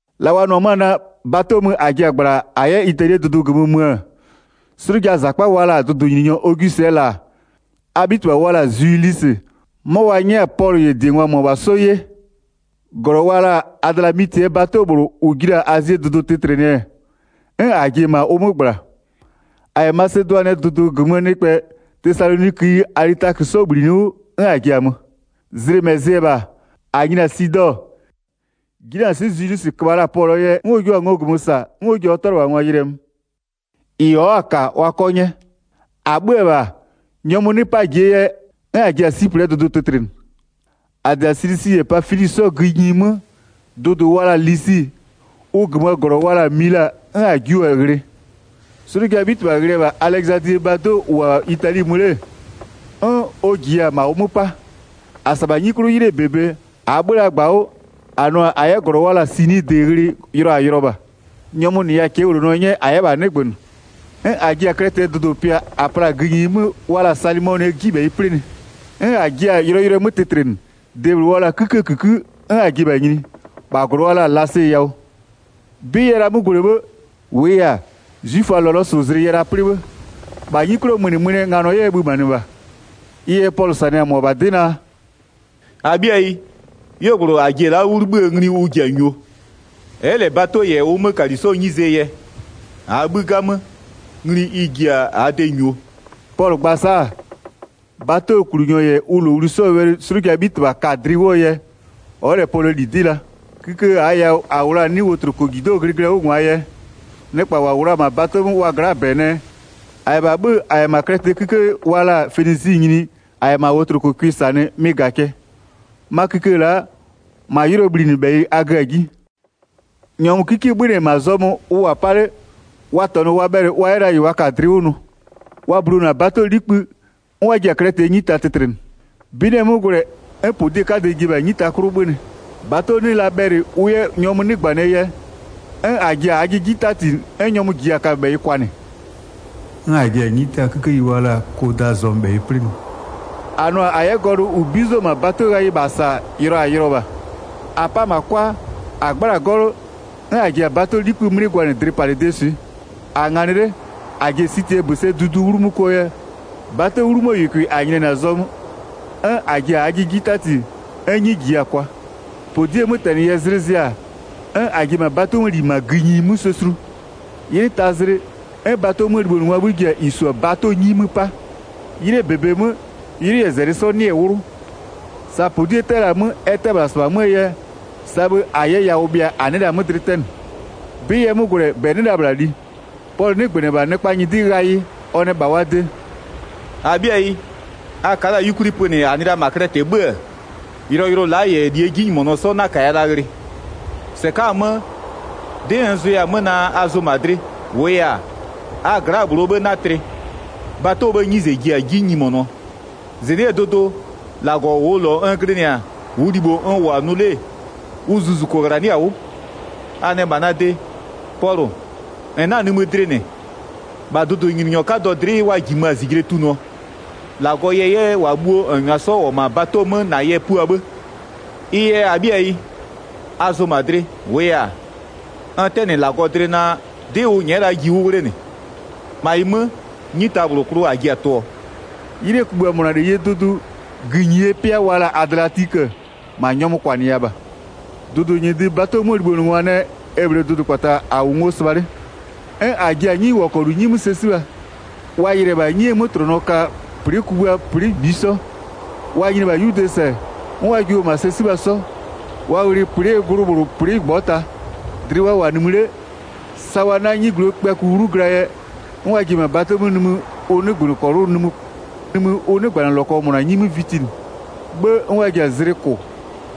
La wa nʋ-ɔ 'mö-a naa, bato mö -a ji-a -gblaa -a 'yɛ Italie dʋdʋ -gömö mö-ö, 'slʋjaa -zakpa wa la-a dʋdʋnyininyɔ Ogwisɩɛ -la, a 'bhitɩbha wa la-a Zwilisɩ, 'mɔ wa 'nyɛ-a Pɔlʋ -yɛ -diengwa -mʋmʋa 'sɔ 'ye. 2-Glɔ wa la-a Adlamitɩɛ bato -bhlʋ -ʋ ji la-a Azie dʋdʋ tɩtlɩnɩɛ, 'n -a ji-e -ma ʋ 'mö -gbla. -A -yɛ Masedʋanɩɛ dʋdʋ -gömöö nɩkpɛ Tesaloniköyi Alitakö 'sɔ -bhlinɩ 'wʋ, 'n -a ji-a mö. Zlɩ -mɛ zɩ-ɛ -bha, -a nyini-a Sidɔ-ɔ, 'jinanɩswɩ'ɩ Zwilisɩ köbha la-a Pɔlʋɔ yɛ 'n ɔ jio-a ngo -gömö -sa 'n ɔ ji-a ɔ 'tʋalɩbhangwa yɩlɩɛ mö, -ɩ ɔ'ɔ-a -ka wa 'kɔ 'nyɛ. 4-A 'bhö-ö -bha, nyɔmʋ 'nɩ 'paa ji-e yɛ, 'n -a ji-a Siplɩɛ Dʋdʋ tɩtlɩnɩ. 5-A -dɩ-a Silisi -yɛ Pafili 'sɔɔ gïnyi 'mö, dʋdʋ wa la-a Lisi, ʋ -gömöö -glɔ wa la-a Mila 'n -a jiʋ-a ghlɩ. 'Slʋjaa 'bhitɩbha ghlɩ-ɛ -bha Alɛzadlie bato -ʋ -wʋ-a Itali mö 'le, 'n ɔ -jiya-a -ma ʋ 'mö 'pa. 7-A -sa-a -bha 'nyi 'klʋ 'ylɩɛ -bebe, -aa 'bhö-ö la -gbawʋ, -a nʋ-a -a 'yɛ -glɔ wa la-a Sinidɩ ghlɩ, yʋlɔ -a yʋlɔ -bha. Nyɔmʋ -nɩya-a cɛɛwlonɔ 'nyɛ -a 'yɛ -bha 'nɩgbönɩ. 'N -a ji-a Klɛtɩɛ dʋdʋ -pɩa -a pla-a gïnyi 'mö wa la-a Salɩmɔnɩɛ 'jibhɛyɩ 'plɩnɩ. 'N -a jia-a yʋlɔyʋlʋɛ 'mö tɩtlɩnɩ, de -bhlʋ wa la-a 'kïkëë -kïkë 'n -a ji-e -bha nyini, -bha -glɔ wa la-a Lasee yawʋ. 'Bɩ yɛ la 'mö gwlɛ 'bhë, -wʋʋ yɛ-a, 'zwiföaa lɔlɔsʋzlɩ yɛ la 'plɩ bhë, -bha 'nyi 'klʋɔ mönɩmönɩɛ nganɔ 'wʋ ɛ bhömanɩ -bha. Ɩ yɛ Pɔlʋ -sanɩ-a -mʋabha 'dɩ naa: “-Abhɩayi, 'yuogblʋ -a ji-e la'a 'wʋ 'libhïë ngli ʋ ji-a -nyuo. Ɛ'ɛ -lɛ bato -yɛ ʋ 'mökali 'sɔɔ 'nyizee yɛ. -Aa 'bhï 'gamö, ngli ɩ ji-a -aa de -nyuo.” Pɔlʋ gba-a sa'a, batoklunyɔ -yɛ ʋ -lowli 'sɔɔ wɛlɩ 'slʋjaa 'bhitɩbha ka-a dlɩ 'wʋɔ yɛ, ɔ'ɔ -lɛ Pɔlʋɔ -li 'dɩ la. Kïkë -aa yawʋ -a -wʋ la-a 'nɩ wotlokojido'oo glɩglɩɛ 'wʋ -ngwaa yɛ, nɩkpa -wa -wʋ la-a -ma bato 'mö wa gla'aa -bɛ nɛ, -a -yɛ -bha 'bhö-ö -a -yɛ -ma Klɛtɩɛ 'kïkë wa la-a Fenisɩ nyini -a -yɛ -ma wotlokoo 'cʋɩ -sanɩ mɩ-ɩ -ga-a cɛ. 'Ma kïkë la'a, -ma 'ylʋɔ bhlinɩbhɛyɩ a gö-a 'ji. Nyɔmʋ 'kikie 'bhönɩ-ɛ -ma zɔmö ʋ -wʋ-a 'pa 'le, wa -tɔnʋ wa bhɛlɩ wa 'yɛ la -ɩ wa ka-a dlɩ 'klʋ nʋ. Wa bulonʋ-a batoo 'likpë, 'n wa ji-a Klɛtɩɛ 'nyita tɩtlɩnɩ. 'Bɩ 'nɩ-ɛ 'mö gwlɛ 'n -podiee 'kadɛ ji-e -ma 'nyita 'klʋ 'bhönɩ. Bato 'nɩ la bhɛlɩ ʋ 'yɛ nyɔmʋ 'ji 'nɩgbönɩɛ yɛ, 'n -a ji-a -aajɩ 'ji 'tati 'n nyɔmʋ -jiya-a kaböbhɛyɩ kwanɩ. 'N -a ji-a 'nyita 'kikeyi wa la-a Kodaa zɔmöbhɛyɩ 'plɩnɩ. -A nʋ-a -a 'yɛ gɔlʋ -ʋ 'bizo-o -ma batoo ghayɩ -bha -sa yʋlɔ -a yʋlɔ -bha. 17-A 'pa-a -ma 'kwa, -a 'gbla-a 'gɔlʋ, 'n -a ji-a bato 'likpï 'mlɩ gwanɩ dlɩpalɩdee swɩ. -A-a nganɩ 'le -a ji-e Sitɩɛ -bösɛdudu 'wlu 'mö kʋɔ yɛ, bato 'wlumöö -yʋkʋɩ -a nyinianɩ-a zɔmö, 'n -a ji-a -aajɩ 'ji 'tati 'n 'nyi -jiya-a kwa. 18-Podiee 'mötɛnɩ yɛ zlɩ zɩ-a, 'n -a ji-e -ma bato 'möö -li -ma gïnyi 'mö sɛ sulu. 'Ylɩ taa zlɩ, 'n bato 'möö libhonʋngwaa 'bhï ji-a -ɩ -su-a bato 'nyi 'mö 'pa. 'Ylɩɛ -bebe 'mö, 'ylʋ -yɛ -zɛlɩ 'sɔ 'nɩ-ɛ 'wlʋ. Sa -podie 'tɛ-ɛ la-a 'mö ɛ 'tɛ-ɛ -bhla -sɩbha 'möö yɛ, sa bhë -a 'yɛ yawʋ bhɩa -a 'nɩɩ la-a 'mö dlɩ 'tɛnɩ. 'Bɩ yɛ 'mö gwlɛ -bɛ 'nɩ la -bhla li. Pɔlʋ 'nɩgbönɩ-ɛ -bha nɩkpaa nyɩdɩ ghayɩ, ɔ nɛ -bha wa de: “-Abhɩayi, a ka'a la 'yukwli pönɩ -a nɩ la -ma Klɛtɩ 'bhö-ö, yʋlɔyʋlʋ la'a -yɛ -lie 'jinyimonɔ 'sɔ 'na-a -kaya la ghlɩ. 22-Sɩka'a-a 'mö, 'dɩ n zʋya-a 'mö naa a zʋ -ma dlɩ, -wʋʋ yɛ-a, a gla'aa -bhlʋɔ 'bhë 'na tlɩ. Bato 'bhëë 'nyize ji-a 'ji nyimonʋɔ. 23-Zɩnɩ'ɩɛ dʋdʋ, -Lagɔ -ʋʋ -lɔ n glɩnɩ-a -ʋʋ libho n -wʋ-a nʋ 'le, ʋ zuzuko -ghlanɩ'ɩ-a 'wʋ. A nɛ -bha na de: Pɔlʋ, -n 'na-a nimï dlɩ -nɩ, -bha dʋdʋnyininyɔ 'kadɔ dlɩ'ɩ wa -jimö-a -zijle tunʋɔ. -Lagɔ yɛ 'yɛ -wa bhuo -n -nyʋa 'sɔ -wʋ-ɔ -ma bato 'mö na yɛ pua 'bhë. Ɩ yɛ -abhɩayi, a zʋ -ma dlɩ, -wʋʋ yɛ-a, n 'tɛnɩ -Lagɔ dlɩ naa, 'dɩ ʋ nyɛ'ɛ-ɛ la'a ji 'wʋ 'wlenɩ. 26-Ma ɩ 'mö 'nyita -bhlʋ klʋ -a ji-a tʋɔ.” 'Ylɩɛ kugbïa -mʋna -leyie dʋdʋ, gïnyie pɩa -a wa la-a Adliatikö, -ma nyɔmʋ -kwanɩya -bha. Dʋdʋnyɩdɩ bato 'möö libhonʋngwa nɛ e -bhlee dʋdʋkpata -a -wʋ ngo sɩbha 'le. 'N wa ji-a 'nyiwɔkɔlu 'nyi 'mö sɛ 'sibha. Wa yɩlɩ-ɛ -bha 'nyie 'mötlʋnɔ -ka plɩ'ɩɛ kugbïa plɩ'ɩ -ngbisɔ. Wa nyini-e -bha 'yude -sɛ, 'n wa jiʋ-o -ma sɛ 'sibha 'sɔ, wa ghlɩ plɩ'ɩɛ glʋ -bhlʋ plɩ'ɩ -ngbɔta. Dlɩ wa -wʋ-a nimï 'le, sa wa 'na 'nyigluo kpïaku 'wlu glaa yɛ, 'n wa ji-e -ma batoo nimï ʋ 'nɩgbanɩlɔkɔ -mʋna 'nyi 'mö vitinɩ, 'bhë 'n wa ji-a zlɩ -kʋ,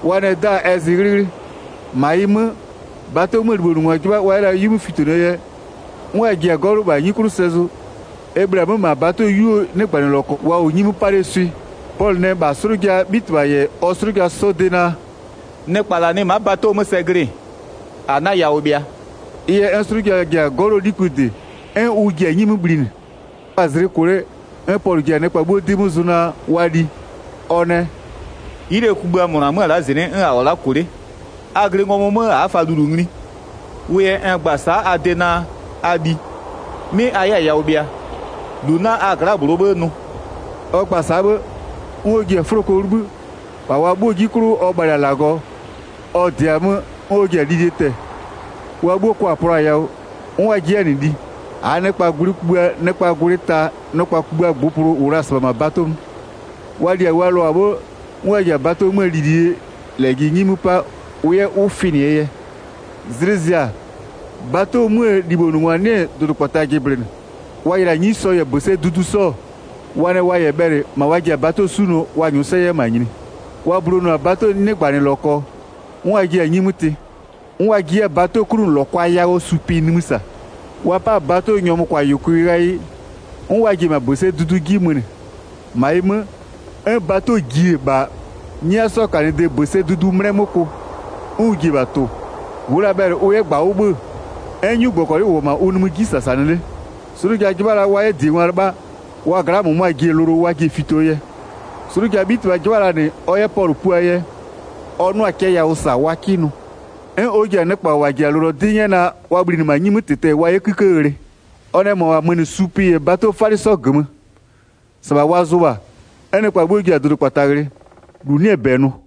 wa nɛ 'da-a ɛ zɩ 'ghlɩghlɩ. 30-Ma ɩ 'mö, bato 'möö libhonʋngwa 'jɩbha wa 'yɛ la 'wi 'mö fitonʋɔ yɛ, 'n wa ji-a 'gɔlʋ -bha 'nyi 'klʋ sɛ zʋ, e -bhlee-a 'mö -ma bato 'yuo 'nɩgbanɩlɔkɔ wa -wʋ 'nyi 'mö 'pa 'lee swɩ. Pɔlʋ nɛ -bha 'slʋjaa 'bhitɩbha -yɛ ɔ 'slʋja 'sɔɔ de naa: “Nɩkpa -la nɩ ma'a bato 'mö sɛ glɩ-ɩ, a 'na yawʋ bhɩa.” Ɩ yɛ, 'n 'slʋja ji-a 'gɔlʋɔ 'likpï -dɩ, 'n ʋ ji-a 'nyi 'mö bhlinɩ. Wa-a zlɩ -kʋ 'le, 'n Pɔlʋ ji-a nɩkpa 'bhuo 'dɩ 'mö zʋ naa, wa li. Ɔ nɛ: “'Ylɩɛ kugbïa -mʋna 'mö-ö la'a -zɩnɩ'ɩ, 'n a -wʋ-a -kʋ 'le, a glɩ ngɔmʋ 'mö a'a fa -lulu ngli. Wʋ yɛ n gba-a sa'a a de naa a li, 'mɩ a 'yɛ-a yawʋ bhɩa, -lu 'na a gla'aa -bhlʋɔ 'bhë nʋ.” Ɔ gba-a sa'a 'bhë, 'n ɔ ji-a 'fʋloko 'wʋ 'libhï, -bha wa 'bhuo 'ji 'klʋ ɔ bhalɩ-a -Lagɔ, ɔ -dɩa-a 'mö 'n ɔ ji-a lilie tɛ-ɛ. Wa 'bhuo 'kwa plʋa-a yawʋ, 'n wa ji 'yɛ-a -nɩ li. 37-Aa nɩkpaa gwlɩ kugbïa nɩkpaa gwlɩ ta nɩkpa kugbïa -ngbʋpʋlʋ -wʋ la-a -sɩbha -ma bato 'mö. Wa li-a wa lʋ-a 'bhë, 'n wa ji-a bato 'möö lilie -lɛjɩ 'nyi 'mö 'pa ʋ 'yɛ 'wʋ fɩnɩɛ yɛ. Zlɩ zɩ-a, bato 'möö libhonʋngwa 'nɩ-ɛ dʋdʋkpata jɩblɩnɩ, wa yɩlɩ-a 'nyisɔ -yɛ -bösɛdudu 'sɔ-ɔ, wa nɛ wa -yɛ bhɛlɩ -ma wa ji-a bato 'sunʋɔ wa -nyʋʋ 'yɛ -ma nyini. Wa bulonʋ-a batoo 'nɩgbanɩlɔkɔ, 'n wa jiɩ-a 'nyi 'mö tɩ. 'N wa ji 'yɛ-a batoo 'klunʋlɔkwa yawʋɔ supɩ nimï -sa. Wa 'pa-a bato nyɔmʋköbhayʋkʋɩ ghayɩ, 'n wa ji-e -ma -bösɛdudu 'ji mönɩ. 41-Ma ɩ mö, 'n bato ji-e -bha 'nyia 'sɔɔ -kanɩdee -bösɛdudu 'mlɛ 'mö kʋ, 'n ʋ ji-e -bha tʋ-ʋ. Ʋ'ʋ la bhɛlɩ ʋ 'yɛ -gbawʋ 'bhö-ö, 'n 'nyugbɔkɔlɩ -wʋ-ɔ -ma ʋ nimï 'ji -sasanɩ 'le. 'Slʋja 'jɩbha la wa 'yɛ -diengwa 'lɩbha, wa gla'aa -mʋmʋa ji-e lʋlʋ wa ji-e fitoo yɛ. 'Slʋjaa 'bhitɩbha 'jɩbha la -nɩ ɔ 'yɛ Pɔlʋ puaa yɛ, ɔ 'nʋa-a cɛ yawʋ -sa wa 'kɩ nʋ. 'N ɔ ji-a nɩkpa -wa -ji-a lʋlʋɔ 'dɩ 'nyɛ naa wa bhlinɩ -ma 'nyi 'mö -tɩtɛ-ɛ wa 'yɛ 'kïkë ghlɩ. Ɔ nɛ -mʋabha mönɩ supɩ -yɛ batoo 'falɩ 'sɔ -gömö. -Sɩbha wa zʋ -bha. 'N nɩkpa 'bhuo ji-a dʋdʋkpata ghlɩ, -lu 'nɩ-ɛ -bɛ nʋ.